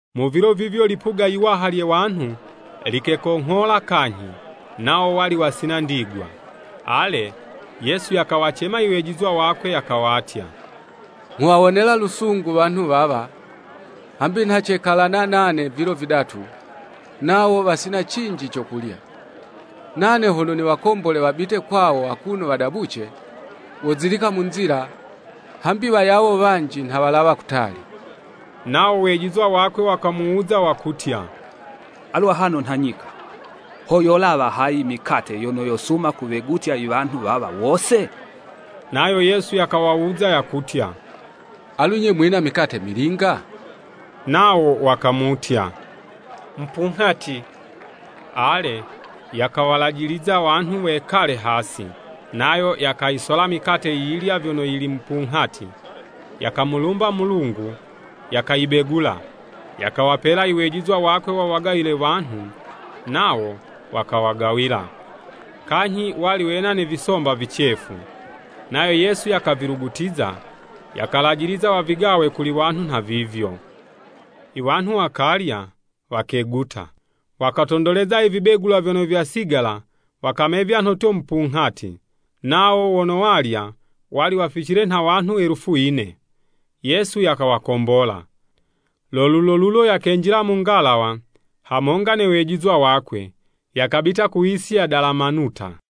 Mu vilo vivyo lipuga yiwaha lye wanhu likekonghola kanyhi, nawo wali wasina ndigwa. Ale, Yesu yakawacema iwejizwa wakwe, yakawatya, “Nghuwawonela lusungu wanhu wawa, hambi nha cekalana nane vilo vidatu, nawo wasina cinji co kulya. Nane hono niwakombole wabite kwawo akuno wadabuce, wozilika mu nzila, hambi wayawo wanji nha walawa kutali.” Nawo wejizwa wakwe wakamuwuza, wakutya, “Alu ahano nha nyika, ho yolawa hayi mikate yono yosuma kuwegutya i wanhu wawa wose?” Nayo Yesu wakawawuza, yakutya, “Alu 'nye mwina mikate milinga?” Nawo wakamutya, “Mupunghati.” Ale, yakawalajiliza wanhu wekale hasi. Nayo yakayisola mikate yiyilya vyono yili mupunghati, yakamulumba Mulungu, yakayibegula, yakawapela iwejizwa wakwe wawagawile wanhu, nawo wakawagawila. Kanyhi wali wena ne visomba vicefu. Nayo Yesu yakavilugutiza, yakalajiliza wavigawe kuli wanhu nhavivyo. Iwanhu wakalya, wakeguta. Wakatondoleza ivibegulwa vyono vyasigala wakamemya nhoto mupunghati. Nawo wono walya wali waficile nha wanhu elufu yine. Yesu yakawakombola, lo lulolulo yakenjila mu ngalawa hamonga ne wejizwa wakwe, yakabita ku yisi ya Dalamanuta.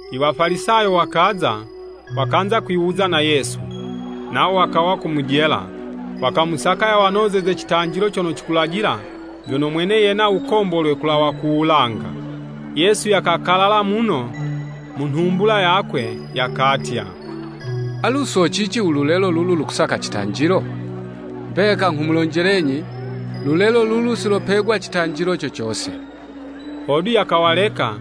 Iwafalisayo wakaza, wakanza kwiwuza na Yesu. Nawo wakawa kumujela, wakamusaka yawanozeze citanjilo cono cikulajila vyono mwene yena wukombolwe kulawa ku wulanga. Yesu yakakalala muno mu nhumbula yakwe, yakatya, “Alu so cici u lulelo lulu lukusaka citanjilo? Mbeka nghumulonjelenyi lulelo lulu silopegwa citanjilo co cose.” Hodu yakawaleka,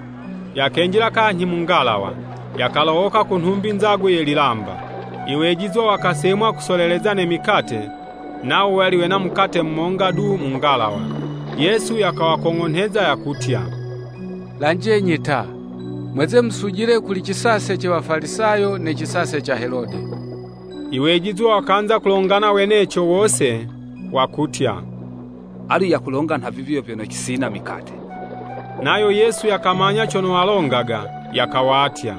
yakenjila kanyhi mu ngalawa, yakalowoka ku nhumbi nzagwe ye lilamba. Iwejizwa wakasemwa kusoleleza ne mikate, nawo wali wena mukate monga du mu ngalawa. Yesu yakawakong'onheza, yakutya, “Lanjenyi ta! Mweze musujile kuli cisase ce Wafalisayo ne cisase ca Helode.” Iwejizwa wakanza kulongana weneco wose, wakutya, “Alu yakulonga nha vivyo vyono cisina mikate.” Nayo Yesu yakamanya cono walongaga, yakawatya,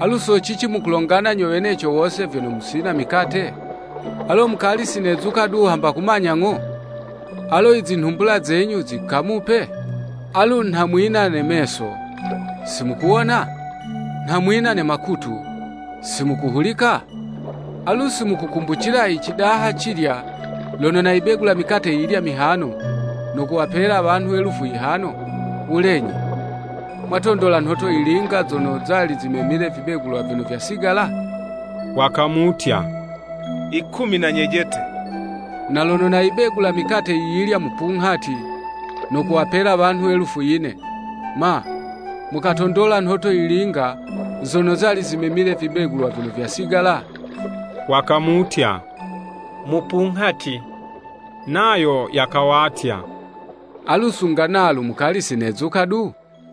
“Alu so cici mukulongana nyo weneco wose vyono musina mukate? Alo mukali sinezuka du, hamba kumanya ng'o? Alo i zinhumbula zenyu zikamupe? Alu nha mwina ne meso, simukuwona? Nha mwina ne makutu, simukuhulika? Alu simukukumbucila, i cidaha cilya lono nayibegula mikate yiyilya mihano, no kuwapela wanhu elufu yihano? Wulenyi, mwatondola nhoto yilinga zono zali zimemile vibegulwa vyono vyasigala?” Wakamutya, “Ikumi na nyejete.” “Na lono nayibegula mikate yiyilya mupunghati no kuwapela wanhu elufu yine, ma, mukatondola nhoto yilinga zono zali zimemile vibegulwa vyono vyasigala?” Wakamutya “Mupunghati.” Nayo yakawatya, “Alu sunga nalu mukali si nezuka du?”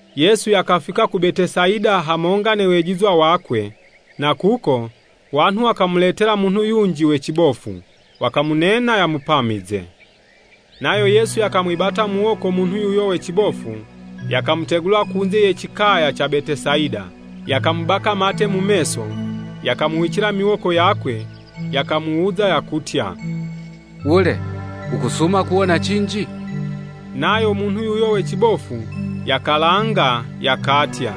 Yesu yakafika ku Betesayida hamonga ne wejizwa wakwe. Na kuko, wanhu wakamuletela munhu yunji we cibofu, wakamunena yamupamize. Nayo Yesu yakamwibata muwoko munhu yuyo we cibofu, yakamutegula kunze ye cikaya ca Betesayida. Yakamubaka mate mu meso, yakamuwicila miwoko yakwe, yakamuwuza, yakutya, “Wule, wukusuma kuwona cinji.” Nayo u munhu yuyo we cibofu yakalanga, yakatya,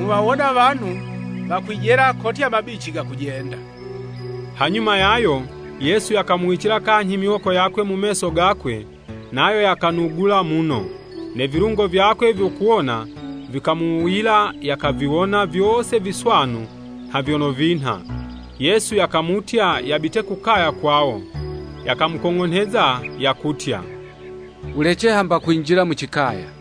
“Nghuwawona wanhu wakwijela kotya mabici gakujenda.” Hanyuma yayo Yesu yakamuwicila kanyhi miwoko yakwe mu meso gakwe, nayo yakanugula muno, ne vilungo vyakwe vyo kuwona vikamuwuyila yakaviwona vyose viswanu nha vyono vinha. Yesu yakamutya yabite ku kaya kwawo, yakamukong'onheza, yakutya, “Wulece hamba kwinjila mu cikaya!”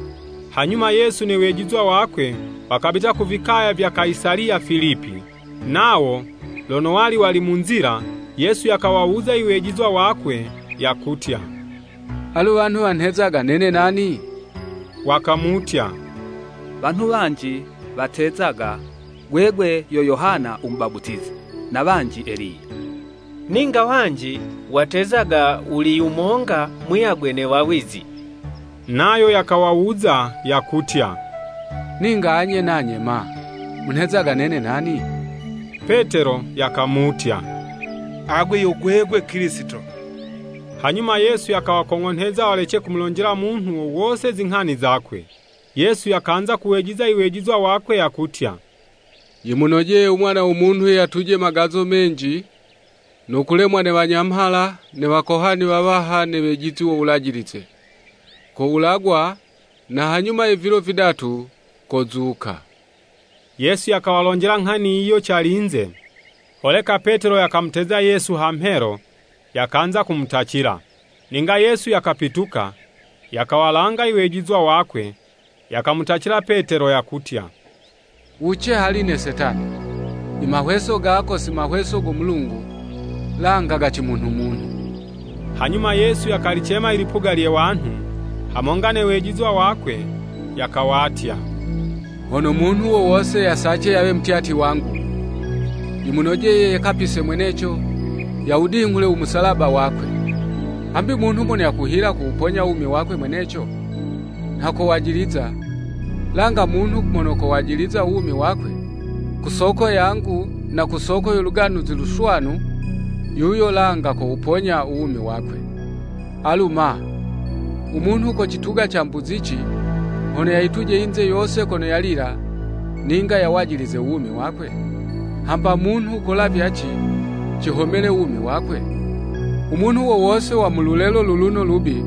Hanyuma Yesu ne wejizwa wakwe wakabita ku vikaya vya Kayisaliya Filipi. Nawo lono wali wali mu nzila, Yesu yakawawuza iwejizwa wakwe, yakutya, “Alu wanhu wanhezaga nene nani?” Wakamutya, “Wanhu wanji watezaga gwegwe yo Yohana u Mubaputizi, na wanji Eliya, ninga wanji watezaga wuli yumonga muyagwe ne wawizi.” Nayo yakawawuza, yakutya, “Ninga anye nanye ma? Munhezaga nene nani?” Petelo yakamutya, “Agwe yo gwegwe Kilisito.” Hanyuma Yesu yakawakong'onheza walece kumulonjela munhu wo wose zinghani zakwe. Yesu yakanza kuwejiza iwejizwa wakwe, yakutya, “Yimunojeye u Mwana wo Munhu yatuje magazo menji no kulemwa ne wanyamhala, ne wakohani wawaha ne wejizi wo Wulajilize. Kowulagwa na hanyuma ye vilo vidatu, kozuka.” Yesu yakawalonjela nghani yiyo calinze. Holeka Petelo yakamuteza Yesu ha mhelo, yakanza kumutacila. Ninga Yesu yakapituka, yakawalanga iwejizwa wakwe, yakamutacila Petelo yakutya, “Wuce hali'ne Setani! Imahweso gako si mahweso go Mulungu, langa ga cimunhu-munhu.” Hanyuma Yesu yakalicema i lipuga lye wanhu, hamonga ne wejizwa wakwe, yakawatya, “Hono munhu wo wose yasace yawe mutyatyi wangu, yimunojeye yekapise mweneco, yawudinghule umusalaba wakwe. Hambi munhu mono yakuhila kuwuponya wumi wakwe mweneco, nha kowajiliza, langa munhu mono kowajiliza u wumi wakwe, ku soko yangu na ku soko yo Luganuzi Luswanu, yuyo, langa kowuponya u wumi wakwe. Alu ma, u munhu kocituga cambuzici, hono yayituje yinze yose kono yalila, ninga yawajilize u wumi wakwe? Hamba munhu kolavyaci, cihomele wumi wakwe? Umunhu wo wose wa mu lulelo luluno lubi,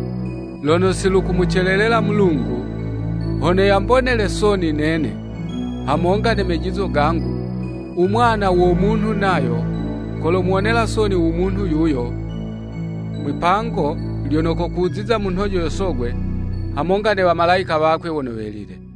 lono si lukumucelelela Mulungu, hono yambonele soni nene, hamonga ne mejizo gangu, Umwana wo Munhu nayo, kolomuwonela soni u munhu yuyo, mwipango lyono kokuziza mu nhojo yo Sogwe, hamonga ne wamalayika wono welile.”